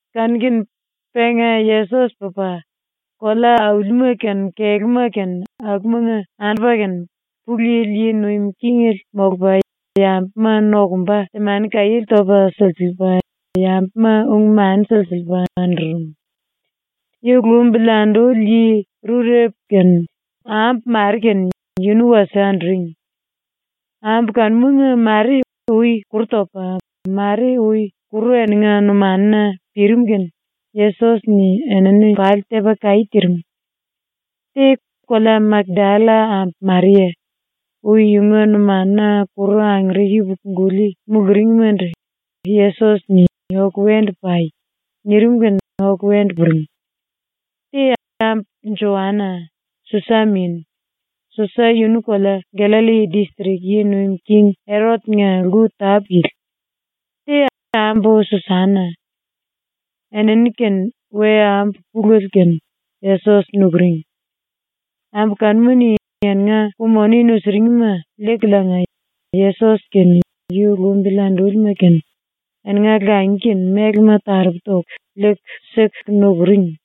Kanu-kene penga Yesos pupa, kolea-aulima kene kelúma kene akumanga andupa kene, Pulu Yili yi nuim kingele molupa yambuma nokumba temani-kaiéle topa silsiliipa, yambuma ung-mani silsiliipa andurum. Yu lumbili anduli yi rurepu kene ambu mare kene yunu wasie anduring. Ambu kanumanga mare ui kuru topa, mare ui kuru eninga numanuna pirim kene Yesos-ni enini pali tepa kaí tirim. Te, kolea Makdalla ambu Maria, ui yunga numanuna kuru angere yupuku-guli muluringmandu Yesos-ni “Oku wendu pai.” nirim kene oku wendu puring. Te, ambu Joana, Susa min. Susa yunu kolea Gallalli distrik yi nuim king Erot-nga lku tápu-yili. Te, ambu Susana. Enini kene we-ambu pulele kene Yesos nukuring. Ambu kanuma-ni eninga ku-moni nusuringma liikuliinga Yesos kene yu lumbili andúlima kene eninga langi kene mélema taropu toku liiku siku nukuring.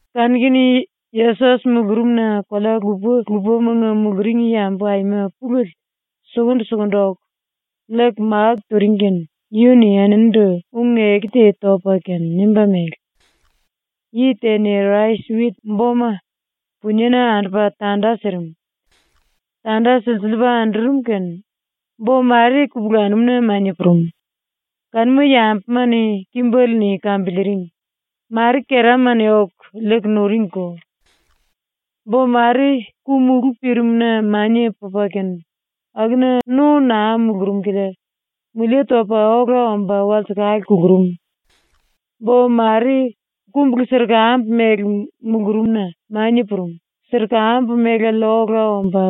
Kanu-kene Yesos mulurumna kolea lupa-lupamanga muluring yambu aima pulele sukundu-sukundu oku, liiku máku turing kene yunu-ni eninindu ung-eku te topa kene nimba mele: “Yi te-ni rais-wit boma puniena andupa tanda sirim. Tanda silsiliipa andurum kene bo mare kupulanum-na mania purum, kanuma yambuma-ni kimbele-ni kambiliiring; mare kerama-ni oku liiku nuringko. Bo mare ku-mulú pirimna mania pupa kene akuna no naa mulurum kilia mulie topa ola omba walsekale kulurum. Bo mare kumbulu-sirkambu mele mulurumna mania purum, sirkambu melale ola omba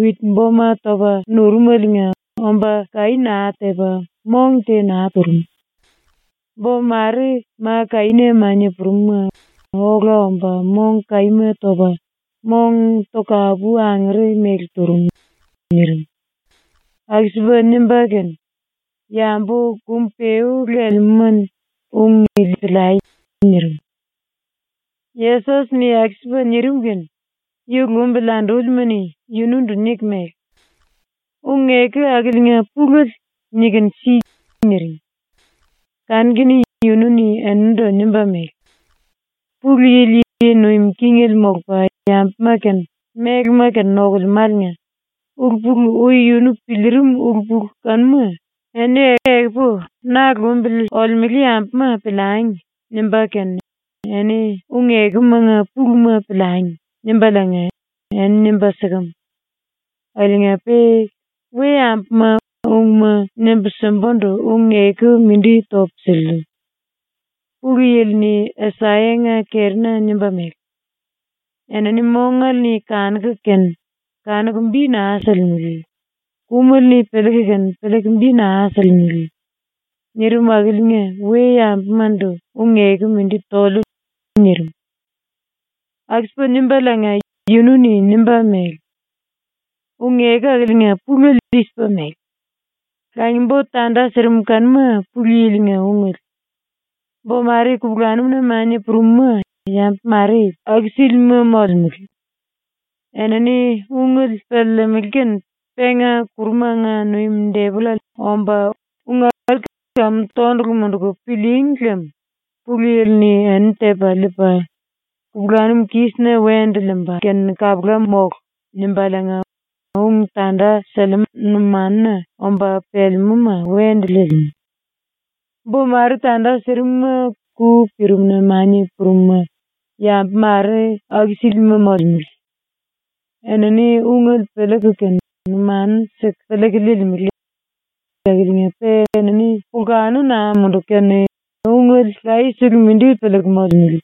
wit-boma topa nurumeliinga omba kaí naa tepa ⸤mong te naa turum⸥. Bo mare ma kaína mania purum-ma ola omba mong kaíma topa, mong tokapu angere mele turum.” ⸤nirim.⸥ ⸤Aku-sipa nimba kene⸥ “Yambu kum-peú lelemúma-ni ung ili piliai.” nirim. ⸤Yesos-ni aku-sipa nirim kene⸥ yu lumbili andúlima-ni yunundu niku mele: “Ung-eku akiliinga pulele nikunu si.” niring. Kanu-kene yunu-ni eninindu nimba mele: “Pulu Yili yi nuim kingele molupa yambuma kene mélema kene nokulemáliinga ulu-pulu ui yunu piliirim ulu-pulu kanuma ‘Eni ekupu ⸤na lumbili olemele yambuma⸥ piliangi.’ nimba kene eni ‘Ung-ekumanga puluma piliangi.’ nimbaliinga eni nimba sikem. Akiliinga-pe we-yambuma ungma nimbu simbundu ung-eku mindi topu siliu. ⸤Pulu Yili-ni Asayanga kerina nimba mele:⸥ ‘Enini mongale-ni kanuku kene kanuku bi naa silimele; kumele-ni piliiku kene piliiku bi naa silimele.’ nirim akiliinga we-yambumandu ung-eku mindi toliu.” nirim. Aku-sipa nimbaliinga yunu-ni nimba mele: “Ung-eku akiliinga pulele i-sipa mele: “Langi-bo tanda sirim kanuma Pulu Yili-nga ungele. Bo mare kupulanum-na mania purum-ma yambu mare aku-sílima molemele. Enini ungele piliilimili kene penga ⸤kurumanga nuim⸥ depollale omba ‘Ung akili kamu tondulu munduku pilííngi lem Pulu Yili-ni enini tepa liipa, kupulanum kísina wendu liimba kene kapula mólu.’ nimbaliinga ung tanda sílima numanuna omba pelemúma wendu liilimú. Bo mare tanda sirim-ma ku pirimna mania purum-ma yambu mare aku-sílima molemele. Enini ungele piliiku kene numanu siku piliiku liilimele. Akiliinga-pe enini pulkanu naa munduku kene ungele layesele mindi piliiku molemele.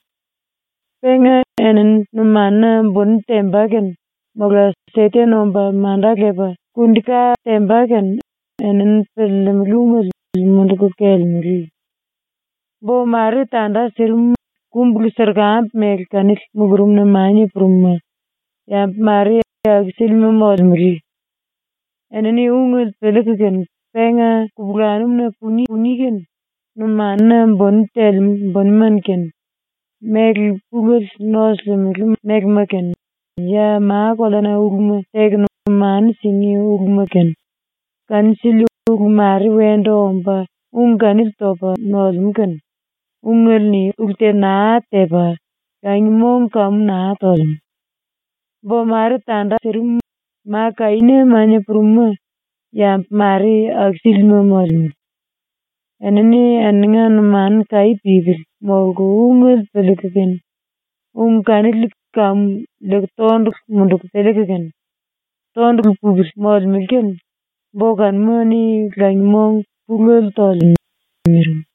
Penga enini numanuna buni temba kene mola ⸤Seten omba⸥ manda lepa kundi-ka temba kene, enini piliilimili ungele munduku kelelemele. Bo mare tanda sirim-ma kumbulu-sirkambu mele kanili mulurumna mania purum-ma yambu mare aku-sílima molemele. Enini ungele piliiku kene penga kupulanum-na pungí kene numanuna buni telemú bunima kene, méle pulele nosulimele mélema kene ya ma-koleana uluma teku numanu singí uluma kene, kanu-sili ulu mare wendu omba ung kanili topa nolemú kene ungele-ni ulu te naa tepa langi-mong kamu naa tolemú. Bo mare tanda sirim-ma ma kaína mania purum-ma, yambu mare aku-sílima molemele. Enini eninga numanu kaí pípili molku ungele piliiku kene ung kanili kamu liiku tondulu munduku piliiku kene, tondulu pupili molemele kene bo kanuma-ni langi-mong ⸤pulele⸥ tolemú.” ⸤nirim.⸥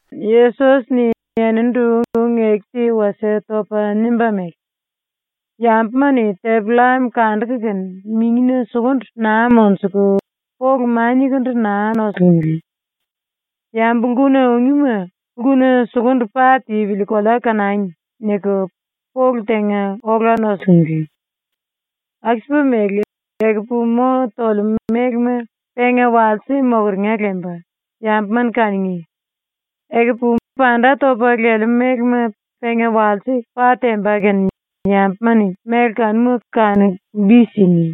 ⸤Yesos-ni eninindu ung-eku te wasie topa nimba mele:⸥ “Yambuma-ni tepi-llam kanduku kene mingina sukundu naa monjuku polu maniakundu naa nosulimele. ‘Yambu lkuna ungíma lkuna sukundu pa tipili kolea kanangi.’ niku polu tenga ola nosulimele. Aku-sipa mele, ekupu mo tolemú mélema penga walse mokeringa lemba, yambuma-ni kanungí; ekupu panda topa lelemú mélema penga walse pa temba kene yambuma-ni méle kanuma kanuku bi singí.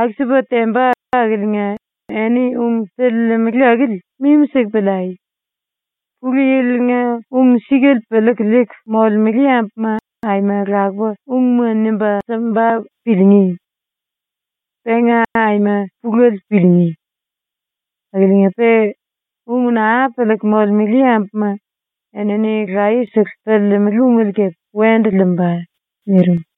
“Aku-sipa temba akiliinga eni ung piliilimili akili mimi-siku piliai. Pulu Yili-nga ung-sikale piliiku liiku molemele yambuma aima lakupa ungma nimba simba piliingí. Penga aima pulele piliingí. Akiliinga-pe ung naa piliiku molemele yambuma enini layesele piliilimili ungele kepe wendu liimba.” nirim.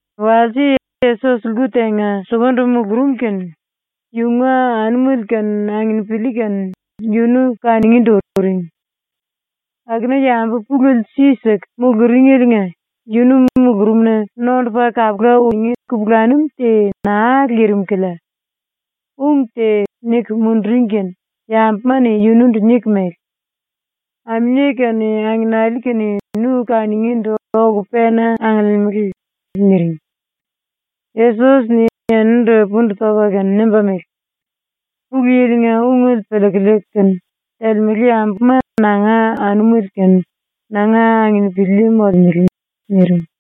Walse Yesos lku tenga sukundu mulurum kene yunga anumele kene anginipili kene yunu kanungíndu uring. Akuna yambu pulele si-si siku muluringeliinga yunu mulurumna nondupa kapula ungí kupulanum te naa lirim kilia ⸤ung te niku munduring kene⸥ yambuma-ni yunundu niku mele: “Aminie kene angenali kene nu kanungíndu oku pena angiliimili.” niring. Yesos-ni eninindu pundu topa kene nimba mele: “Pulu Yili-nga ungele piliiku liiku kene telemele yambuma nanga anumele kene nanga anginipili molemele.” nirim.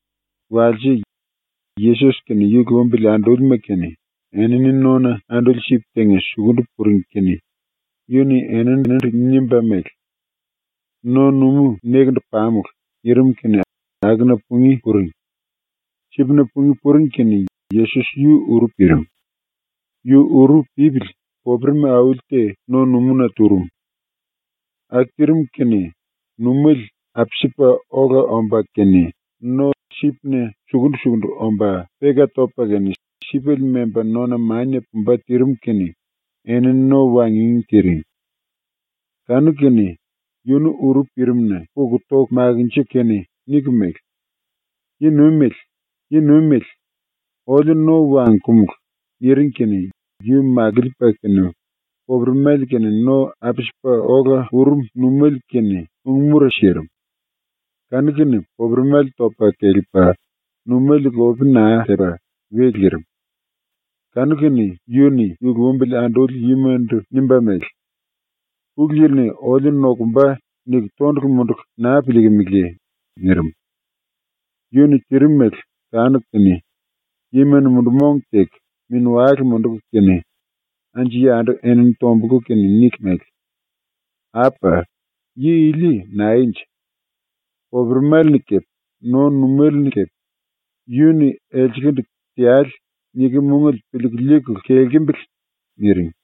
Walse, Yesos kene yu lumbili andúlima kene enini nona anduli sip tenga sukundu puring kene yu-ni eninindu nimba mele: “No-numú nekendu pamulu.” nirim kene akuna pungí puring. Sipna pungí puring kene Yesos yu uru pirim. Yu uru pípili popuremi auli te no-numúna turum. Aku tirim kene ⸤numéle apsipa ola omba kene⸥ no-sipna sukundu-sukundu omba peka topa kene sipele memba nona mania pumba tirim kene enini no wangingí tiring. Kanu-kene yunu uru pirimna puku toku makinjiku kene niku mele: “Yi-Nuimele, Yi-Nuimele, oliu no wangkumulu.” niring kene yu makiliipa kene popuremale kene no apsipa ola urum numéle kene ung-mura sirim. Kanu-kene popuremale topa kelepa, numéle lope naa tepa we lirim. Kanu-kene yu-ni yu lumbili anduli yimandu nimba mele: “‘⸤Pulu Yili-ni oliu nokumba.’ niku⸥ tondulu munduku naa piliikimiliye?” nirim. ⸤Yu-ni tirim mele kanuku kene⸥ yima-ni mundu-mong teku mini-wale munduku kene anju-yandu enini tombulku kene niku mele: “Apa! Yi ili naenje? Popuremale-ni kepe no-numéle-ni kepe yu-ni elselendu “Teale.” nikem ungele piliiku liikulu kelkembele.” niring.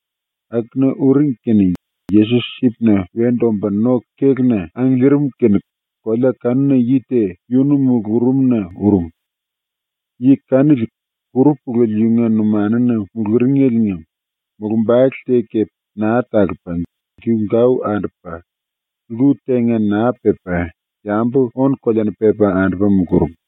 Akuna uring kene Yesos sipna wendu omba no-kéluna angiliirim kene kolea kanuna yi te yunu mulurumna urum. Yi kanili kuru pulele yunga numanuna muluringeliinga mulumbale te kepe naa talupa, giu-gau andupa, lku tenga naa pepa, yambu ónu-koleana pepa andupa mulurum.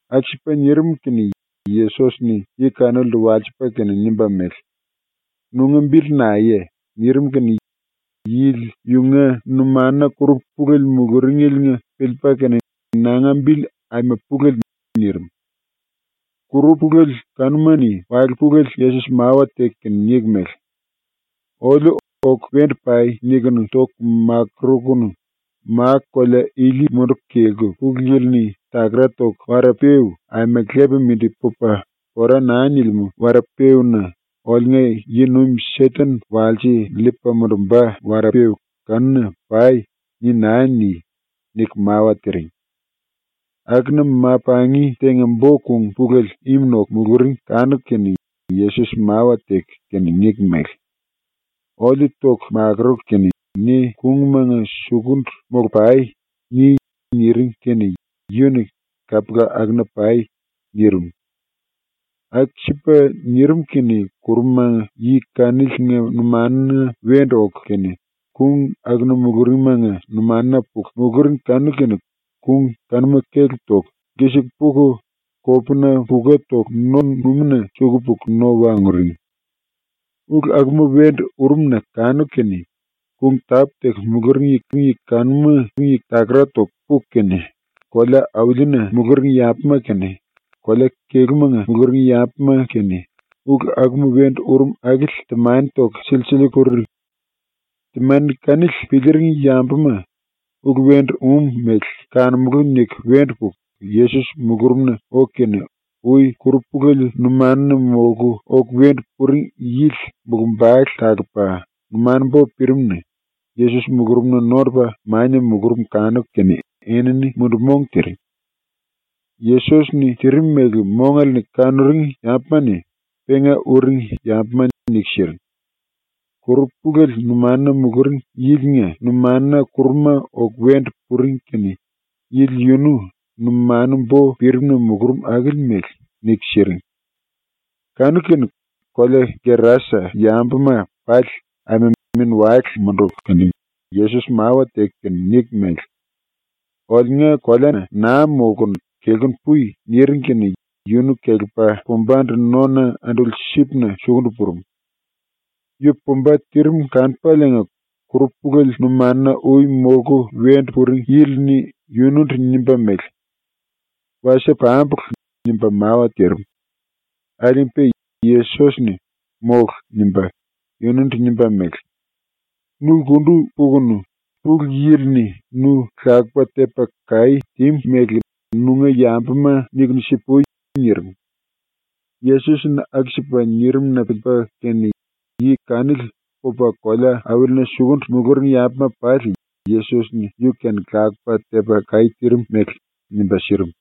Aku-sipa nirim kene Yesos-ni yi kanilindu walsipa kene nimba mele: “Nunga bili naeye?” nirim kene yili yunga numanuna kuru pulele muluringeliinga piliipa kene “Nanga bili Aima Pulele.” nirim. Kuru pulele kanuma-ni wale pulele Yesos mawa teku kene niku mele: “Oliu ‘oku wendu pai.’ nikunu toku makurukunu “⸤Ma-kolea ili munduku kelku⸥ Pulu Yili-ni takara toku wara-peú aima lepa mindi pupa pora naa nilimú wara-peúna ⸤oliunga yi-nuim Seten walse liipa mundumba⸥ wara-peú kanuna pai.” ni naa ni.” niku mawa tiring. Akuna ma-pangi tenga bo-kung pulele im noku muluring kanuku kene Yesos mawa teku kene niku mele: “Oliu ⸤toku makuruku kene⸥ ‘Ne kungmanga sukundu molu-pai.’ ni.” niring kene yu-ni “Kapula, akuna pai.” nirim. Aku-sipa nirim kene kuruma yi kaniliinga numanuna wendu oku kene kung akuna muluringmanga numanuna puku muluring kanu-kene kung kanuma kelep toku lkisiku puku kopuna puka toku no-numúna suku puku no wanguring. Ulu akuma wendu urum-na kanuku kene kung tápu-teku muluring yi kanuma takara toku puku kene, kolea-aulina muluring yambuma kene, kolea-kelúmanga muluring yambuma kene, ulu akuma wendu urum akili temani toku silsiliiku puring. Temani kanili piliiring yambuma ‘Ulu wendu um mele kanumulú.’ niku wendu puku Yesos mulurumna oku kene ui kuru pulele numanuna molku oku wendu puring yili mulumbale talupa, numanu-bo pirim-na Yesos mulurumna nondupa mania mulurum kanuku kene enini mundu-mong tiring. Yesos-ni tirim mele mongale-ni kanuring yambuma-ni penga uring yambuma niku siring. Kuru pulele numanuna muluring yilinga numanuna kuruma oku wendu puring kene yili yunu numanu-bo pirim-na mulurum akili mele niku siring. Kanu-kene kolea Gerasa yambuma pali aima mini-wale munduku kene Yesos mawa teku kene niku mele: “Oliunga koleana naa molkunu kelkunu pui.” niring kene yunu kelepa pumbandu nona anduli sipna sukundu purum. ⸤Yu pumba tirim kanupaliinga⸥ kuru pulele numanuna ui molku wendu puring yili-ni yunundu nimba mele: “Wasie pambulu.” nimba mawa tirim. Akiliinga-pe Yesos-ni “Mólu.” nimba yundu nimba mele: “Nu lkundu pukunu Pulu Yili-ni nu lakupa tepa kaí tímu mele nunga yambuma nikunu si-pui.” nirim. Yesos-ni aku-sipa nirim-na piliipa kene yi kanili pupa kolea-aulina sukundu muluring yambuma pali Yesos-ni yu-kene lakupa tepa kaí tirim mele nimba sirim.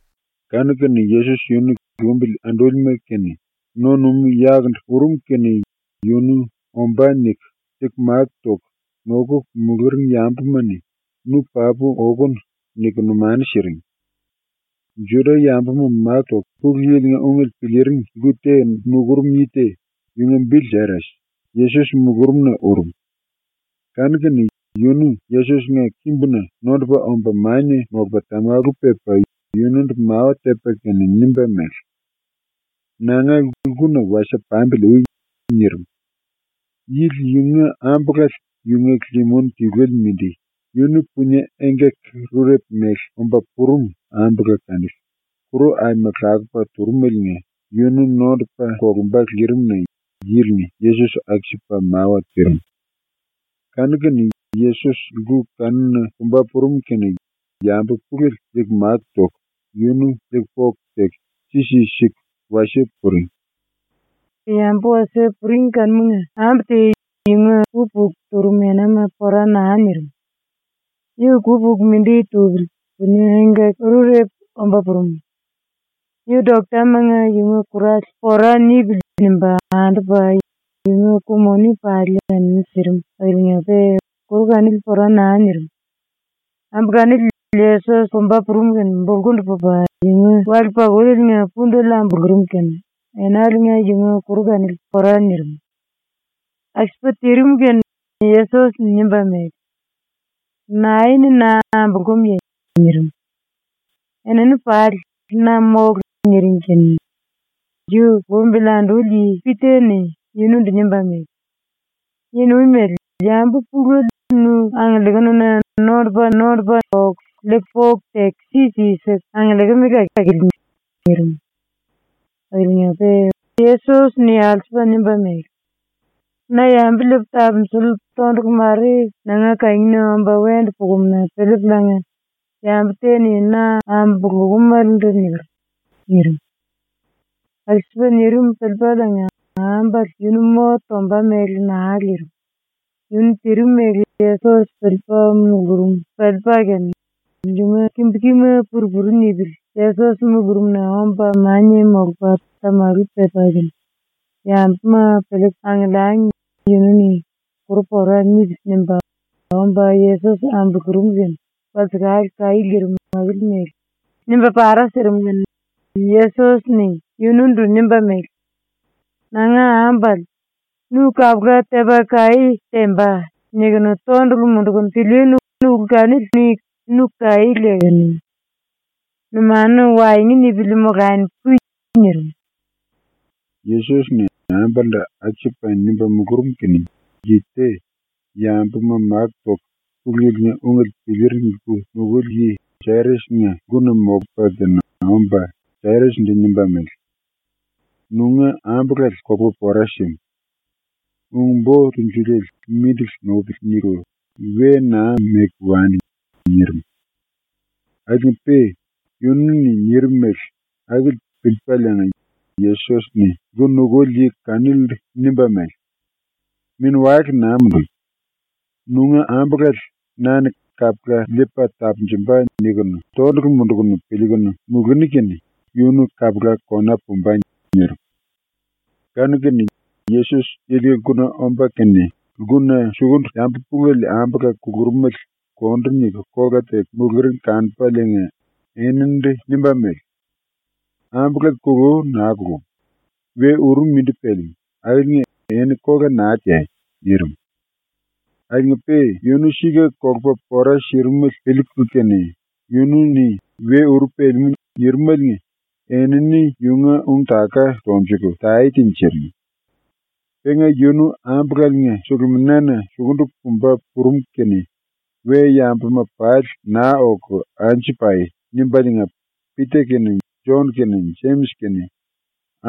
Kanu-kene Yesos yunu ⸤lumbili andúlima kene⸥ no-numú yakundu urum kene yunu ‘Ombá.’ niku liiku máku toku nokuku muluring yambuma-ni “Nu papu okonu.” niku numanu siring. Juda-yambuma máku toku Pulu Yili-nga ungele piliiring lku te nukurum yi te, yunga bili Jairas, Yesos mulurumna urum. Kanu-kene yunu Yesos-nga kimbuna nondupa omba mania molupa tamalu pepa yunundu mawa tepa kene nimba mele: “Nanga lkuna wasie pambili ui.” nirim. Yili yunga ambulale, yunga limin tiluele mindi, yunu punie engkaki-rurepu mele omba purum ambula kanili, kuru aima lakupa turumeliinga yunu nondupa kolumba lirim-na ⸤yili-ni Yesos aku-sipa mawa tirim⸥. Kanu-kene Yesos lku kanuna pumba purum kene yambu pulele liiku máku toku yunu liiku poku teku si-si siku wasie puring. ⸤Yambu wasie puring kanumanga⸥ ambu te yunga ku-puku turum enama pora naa nirim. Yu ku-puku mindi tupili punie engkaki-rurepu omba purum. Yu doktamanga yunga kurale ‘Pora nipili.’ nimba andupa, yunga ku-moni pali enini sirim akiliinga-pe kuru kanili pora naa nirim. Ambu kanili Yesos pumba purum kene bulkundu pupa, yunga wale-pakuleliinga pundele ambulurum kene enaliinga yunga kuru kanili pora nirim. Aku-sipa tirim kene Yesos-ni nimba mele: “Nae-ni na ambulúmuye?” nirim. Enini pali “Na mólu.” niring kene ⸤yu lumbili anduli yi⸥ Pita-ni yunundu nimba mele: “Yi-Nuimele, yambu pulele nu angiliikununa nondupa-nondupa oku liiku poku teku si-si siku angiliikimele akili.” nirim. Akiliinga-pe Yesos-ni alsupa nimba mele: “Na yambu liipu tapunjuliu tondulu mare nanga kangina omba wendu pukumu-na piliipuliinga yambu te-ni na ambulúmelendu niker.” nirim. Aku-sipa nirim piliipaliinga ambale yunu mo tomba mele naa lirim, yunu tirim mele Yesos piliipa mulurum piliipa kene yunga kimbu-kima pur-puru nipili Yesos mulurumna omba mania molupa tamalu pepa kene, yambuma piliiku angiliangi yunu-ni ‘Kuru pora nipili.’ nimba omba Yesos ambulurum kene walsekale kaí lirim akili mele nimba para sirim kene Yesos-ni yunundu nimba mele: “Nanga ambulale, ‘Nu kapula tepa kaí temba.’ nikunu tondulu mundukunu pilíínu ulu kanili-ni nu kaí lekenu. Numanu waengu nipili molani pui.” nirim. Yesos-ni ambalendu aku-sipa nimba mulurum kene, yi te, yambuma máku toku Pulu Yili-nga ungele piliiring lku nukuli yi ⸤Jairas⸥ nga lkuna molupa kene omba ⸤Jairas-ndu⸥ nimba mele: “Nunga ambulale kolupa pora símu. Ung-Bo Tunjuliele ‘Mindili nupili.’ niku we naa meku wani.” nirim. Akiliinga-pe yunu-ni nirim mele akili piliipaliinga Yesos-ni ⸤lku nukuli yi kanilindu⸥ nimba mele: “Mini-wale naa mundui. Nunga ambulale na-ni ‘Kapula liipa tapunjumba.’ nikunu tondulu mundukunu piliikunu muluni kene yunu kapula kona pumba.” nirim. Kanu-kene Yesos yilinga lkuna omba kene lkuna sukundu yambu pulele ambula kulurumele kondu niku kola teku muluring kanupaliinga eninindu nimba mele: “Ambulale kulú naa kulum. We uru mindi pelemú akiliinga eni kola naa teai.” nirim. Akiliinga-pe yunu sika kolupa pora sirimele piliiku kene yunu-ni “We uru pelemú.” nirimaliinga enini yunga ung-taka tonjuku tae tinjiring. Penga yunu ⸤ambulaliinga suluminana⸥ sukundu pumba purum kene ‘We-yambuma pali naa oku anju pai.’ nimbaliinga Pita kene, Jon kene, Jemis kene,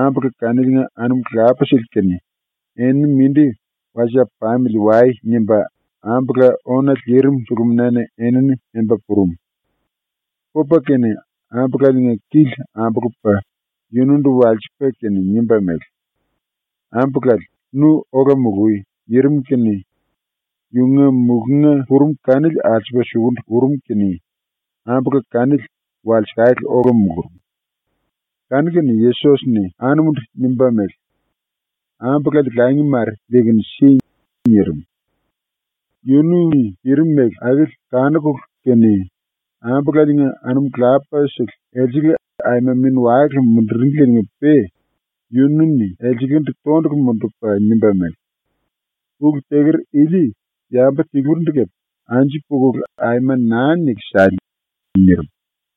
ambula kaniliinga anum lapasele kene “Eni mindi wasie pamili wai.” nimba ⸤ambula ónale lirim⸥ suluminana enini memba purum. Pupa kene ambulaliinga kili ambulupa yunundu walsipa kene nimba mele: “Ambulale, nu ola mului.” nirim kene yunga mulunga purum kanili alsupa sukundu urum kene ambula kanili walsekale ola mulurum. Kanu-kene Yesos-ni ⸤anumundu⸥ nimba mele: “Ambulale langi mare liikunu si.” nirim. Yunu-ni tirim mele akili kanukulu kene ambulaliinga anum lapasele elsele aima mini-wale munduringlieliinga-pe yunu-ni elselendu tondulu mundupa nimba mele: “Ulu teker ili yambu tilurindu kepe anju pukulu aima naa niku sale.” nirim.